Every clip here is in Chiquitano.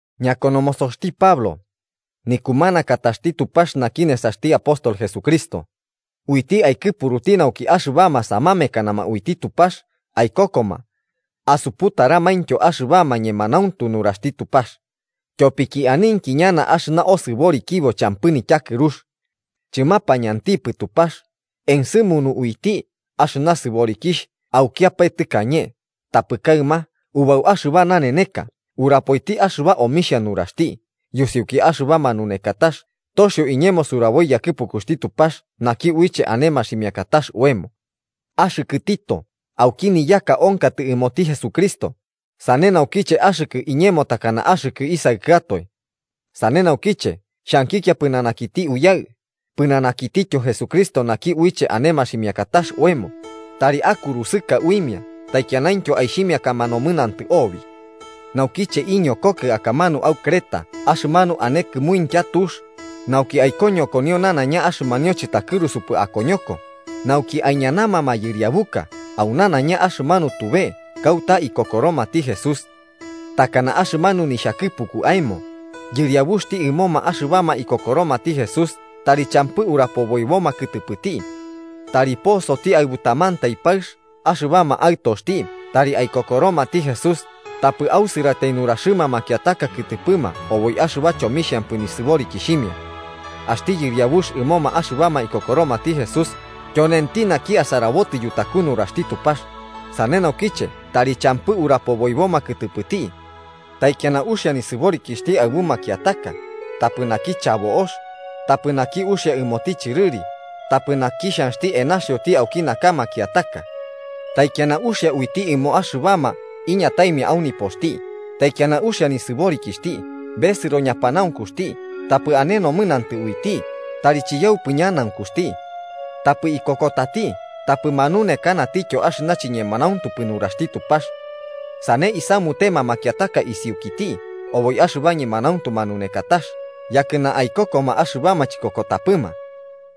Ñakonomosoxti Pablo, nikumanakataxti Tupax naki nesaxti apóstol Jesucristo, uiti aikɨpuruti nauki axɨbama samamekanama uiti Tupax aikokoma asuputariomaintyo axɨba ñemanauntu nuraxti Tupax, tyopiki aninki ñana axɨna osɨborikibo champɨ nityakɨrux. Chɨmapañantipɨ Tupax, ensɨmunu uiti axɨna sɨborikixh aukiapae tɨkañe, tapɨ kaɨma, ubau axɨba naneneka, urapoiti axɨba omixha nuraxti yusiuki axɨba manunekakax toxio iñemo suraboi yakɨpukuxti Tupax naki uiche ane maximiakatax oemo. Axɨkɨ Tito, auki niyaka onkatɨ ɨmoti Jesucristo, sane naukiche axɨkɨ iñemo takana axtɨ isaɨkɨatoe. Sane naukiche xhankikia pɨnanakiti Uyaɨ, pɨnanakitityo Jesucristo naki uiche ane maximiakatax oemo tari akurusɨka uimia taikianaintyo aixhimiakama nomɨnantɨ obi. Naukiche iñokokɨ akamanu au Creta axɨmanu ane kɨmuintya tux, nauki aikoñokonio nanaiña axɨmanu chɨtakɨrusupɨ akoñoko, nauki aiñanama mayɨriabuka au nanaiña axɨmanu tube kauta ikokoromati Jesús. Takana axɨmanu nixhakɨpuku aemo. Yɨriabuxti ɨmoma axɨbama ikokoromati Jesús tari champɨ urapoboiboma kɨtɨpɨti. Tari posoti aɨbu tamantai paɨx, axɨbama aɨtoxti tari aikokoromati Jesús tapɨ ausɨratai nuraxɨma makiataka kɨtɨpɨma oboi axɨba chomixhampatai nisɨborikixhimia. Axti yɨriabux ɨmoma axɨbama ikokoromati Jesús tyonenti naki asarabotɨ yutaku nuraxti Tupax, sane naukiche tari champɨ urapoboiboma kɨtɨpɨti. Taikiana uxia nisɨborikixhti aɨbu makiataka, tapɨ naki chabo'ox, tapɨ naki uxia ɨmoti chɨrɨri, tapɨ naki xhanxti enaxioti auki naka makiataka. Taikiana uxia uiti ɨmoma axɨbama iñataimia au nipoxti, taikiana uxia nisɨborikixhti, besɨro ñapanaunkuxti, tapɨ ane nomɨnantɨ uiti, tari chiyaupɨ ñanaunkuxti. Tapɨ ikokotati tapɨ manunekanatityo axɨna chiñemanauntupɨ nuraxti Tupax. Sane aisamunema makiataka isiukiti oboi axɨba ñemanauntu manunekatax yakɨna aikokoma axɨbama chikokotapɨma.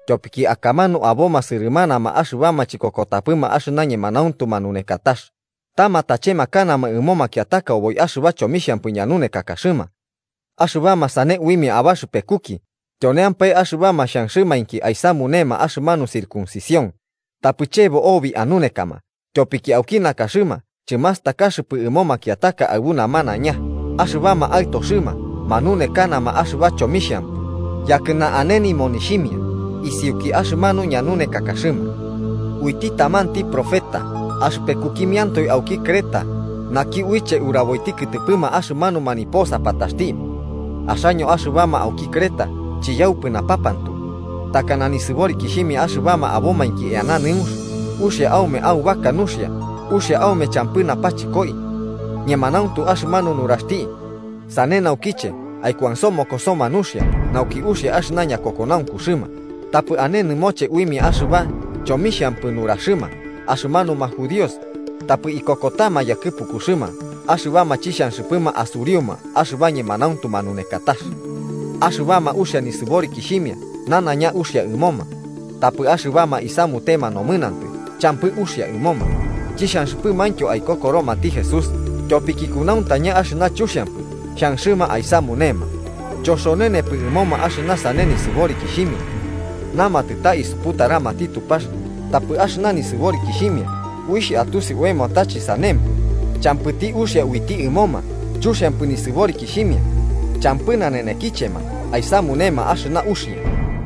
Tyopiki akamanu aboma sɨrɨmanama axɨbama chikokotapɨma axɨna ñemanauntu manunekatax, ta matachemakanama ɨmo makiataka oboi axɨba chomixhampɨ ñanunekakaxɨma. Axɨbama sane uimia abaxɨpekuki, tyonemampae axɨbama xhanxɨmainki aisamunema axɨmanu circuncisión. Tapɨ chebo obi anunekama, tyopiki auki nakaxɨma chɨmastakaxɨpɨ ɨmo makiataka aɨbu namanaiña axɨbama aɨtoxɨma, manunekanama axɨba chomixhampɨ yakɨna ane nimonixhimia isiuki axɨmanu ñanunekakaxɨma. Uiti tamanti profeta axɨpekukimiantoe auki Creta naki uiche uraboiti kɨtɨpɨma axɨmanuma niposapataxti: “Axaño axɨbama auki Creta, chiyaupɨ napapantu, takana nisɨborikixhimia axɨbama abomainki eana nɨunx, uxia aume aubaka nuxia, uxia aume champɨ napachɨkoi.” Ñemanauntu axɨmanu nuraxti. Sane naukiche, aikuansomokosoma nuxia, nauki uxia axɨna ñakokonaunkuxɨma tapɨ ane nɨmoche uimia axɨba chomixhampɨ nuraxɨma axɨmanuma judíos, tapɨ ikokotama yakɨpukuxɨma axɨbama chixhanxɨpɨma asuriuma axɨba ñemanauntu manunekatax. Axɨbama uxia nisɨborikixhimia nanaiña uxia ɨmoma. Tapɨ axɨbama isamutema nomɨnantɨ champɨ uxia ɨmoma, chixhanxɨpɨmaintyo aikokoromati Jesús, tyopiki kunauntaña axɨna chuxiampɨ xhanxɨma aisamunema, choxonenepɨ ɨmoma axɨna sane nisɨborikixhimia. Namatɨ ta isuputaramati Tupax, tapɨ axɨna nisɨborikixhimia uixh atusi oemo ta chɨsanempɨ. Champɨti uxia uiti ɨmoma, chuxiampɨ nisɨborikixhimia, champɨ nanenekichema aisamunema axɨna uxia.